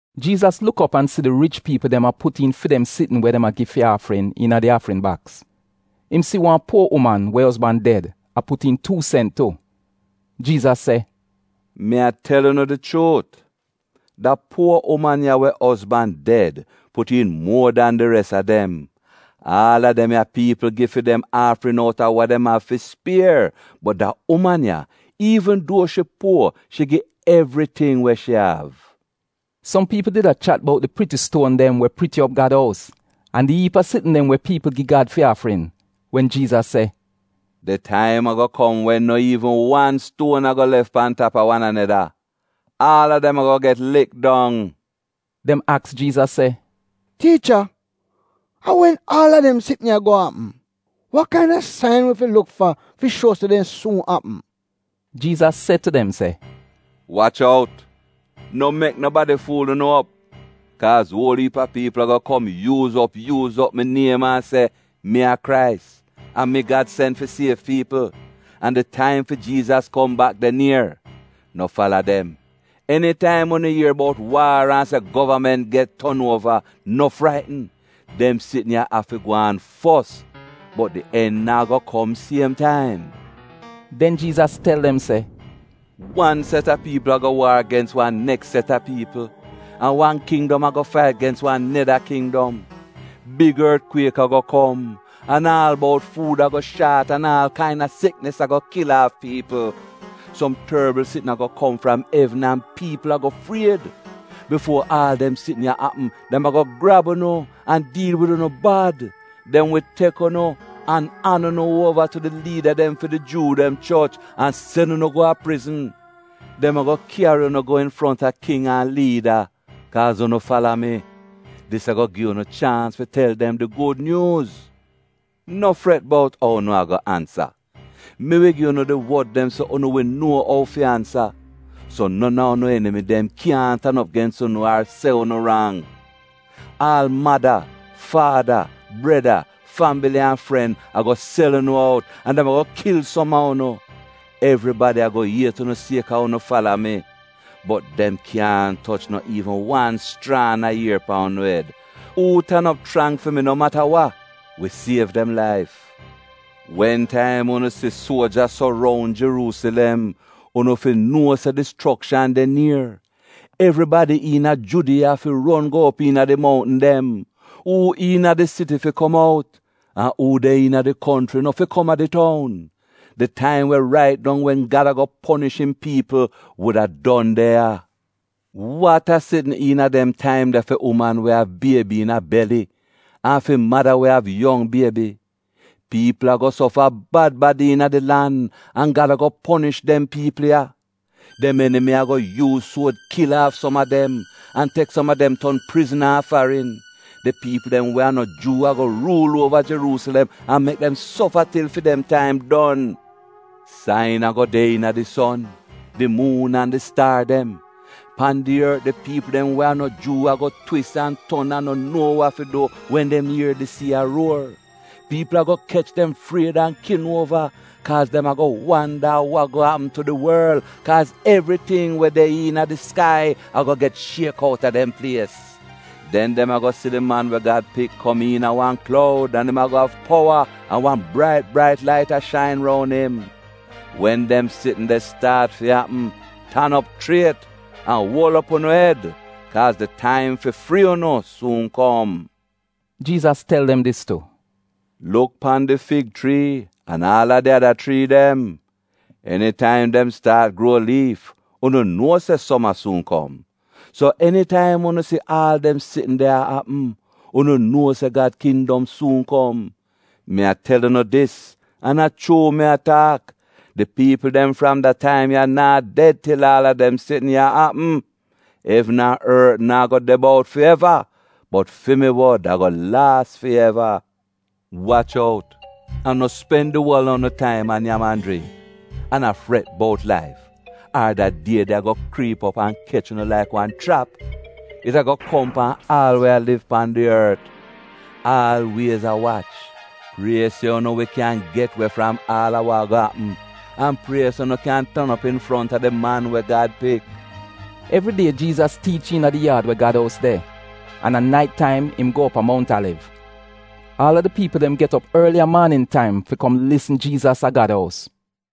Jiizas luk op an si di rich piipl dem a put iin fi dem sitn we dem a gi fi aafrin iina di aafrin baks. Im si wan puo uman, we ozban ded, a put iin tuu sent tu. Jiizas se, “Mi a tel unu di chuut, da puo uman, we ozban ded, put iin muo dan di res a dem. Aal a dem ya piipl gi fi dem aafrin outa wa dem av fi spier, bot da uman ya, iivn duo shi puo, shi gi evriting we shi av.” Som piipl did a chat bout di priti stuon dem we priti op Gad ous an di iip a sitn dem we piipl gi Gad fi aafrin, wen Jiizas se, “Di taim ago kom wen no iivn wan stuon ago lef pan tap a wan aneda. Aal a dem ago get lik dong.” Dem aks Jiizas se, “Tiicha, a wen aal dem sitn ya ago apm? Wa kaina sain wi fi luk fa fi shuo se dem suun apm?” Jiizas se tu dem se, “Wach out, no mek nobadi fuul unu op. Kaaz uol iip a piipl ago kom yuuz op yuuz op mi niem, an a se, ‘Mi a Krais, a mi Gad sen fi siev piipl’ an, ‘di taim fi Jiizas kom bak de nier.’ No fala dem. Enitaim unu ier bout waar an se govament get ton uova, no fraitn. Dem sitn ya av fi gwaan fos, bot di en naa go kom siem taim.” Den Jiizas tel dem se: “Wan set a piipl ago waar gens wan neks set a piipl, an wan kindom ago fait gens wan neda kindom. Big ortkwiek go kom, an aal bout, fuud ago shaat an aal kaina siknis ago kil aaf piipl; som torbl sitn ago kom fram evn an piipl ago fried. “Bifuo aal dem sitn ya apm, dem ago grab unu an diil wid unu bad. Dem wi tek unu an an unu uova tu di liida dem fi di Juu dem choch an sen unu go a prizn. Dem ago kyari unu go infronta king an liida, kaaz unu fala mi. Dis ago gi unu chaans fi tel dem di gud nyuuz. No fret bout ou unu ago ansa. Mi wi gi unu di wod dem so unu wi nuo ou fi ansa, so non a unu enimi dem kyaahn tan op gens unu ar se unu rang. Aal mada, faada, breda, fambili an fren, ago sel unu out, an dem ago kil som a unu. Evribada ago iet unu sieka unu fala mi. Bot dem kyaahn toch no iivn wan schraan a ier pan unu ed. Uu tan op chrang fi mi no mata wa, wi siev dem laif. “Wen taim unu si se suoja soroun Jeruusilem, unu fi nuo se dischrokshan de nier. Evribadi iina Judiya fi ron go op iina di mountn dem. Uu iina di siti fi kom out an uu de iina di konchri no fi kom a di toun. Di taim wa rait dong wen Gad ago ponish im piipl wuda don de ya. Wat a sitn iina dem taim de uman we av biebi iina beli an fi mada we av yong biebi! Piipl ago sofa bad bad iina di lan, an Gad ago ponish dem piipl ya. Dem enimi ago yuuz suod kil aaf som a dem, an tek som a dem ton prizna a farin. Di piipl dem we a no Juu ago ruul uova Jeruusilem an mek dem sofa til fi dem taim don. “Sain ago de iina di son, di muun an di staar dem. Pan di ort, di piipl dem we a no Juu ago twis an ton an no nuo wa fi du wen dem ier di sii a ruor. Piipl ago kech dem fried an kin uova kaaz dem ago wanda wa ago apm tu di worl, kaaz evriting we de iina di skai ago get shiek outa dem plies. Den dem ago si di Man we Gad Pik a kom iina wan kloud an im ago av powa an wan brait brait lait a shain roun im. Wen dem sitn de staat fi apm, tan op chriet an uol op unu ed kaaz di taim fi frii unu suun kom.” Jiizas tel dem dis tu, “Luk pan di fig chrii an aal di ada chrii dem. Enitaim dem staat gruo liif, unu nuo se soma suun kom. So enitaim unu si se aal dem sitn de a apm, unu nuo se Gad kindom suun kom. “Mi a tel unu dis an a chuu mi a taak, di piipl dem fram da taim ya naa ded til aal a dem sitn ya apm. Evn an ort naa go de bout fi eva, bot fi mi wod ago laas fi eva. “Wach out an no spen di uol a unu taim a nyam an jringk, an a fret bout laif, ar da die de ago kriip op an kech unu laik wan chrap. It ago kom pan aal we a liv pan di ort. Aalwiez a wach, prie se unu wi kyan get we fram aal wa ago apm, an prie se unu kyan tan op infronta di Man we Gad Pik.” Evridie Jiizas tiich iina di yaad we Gad ous de, an a nait taim im go op a Mount Aliv. Aal a di piipl dem get op orli a maanin taim fi kom lisn Jiizas a Gad ous.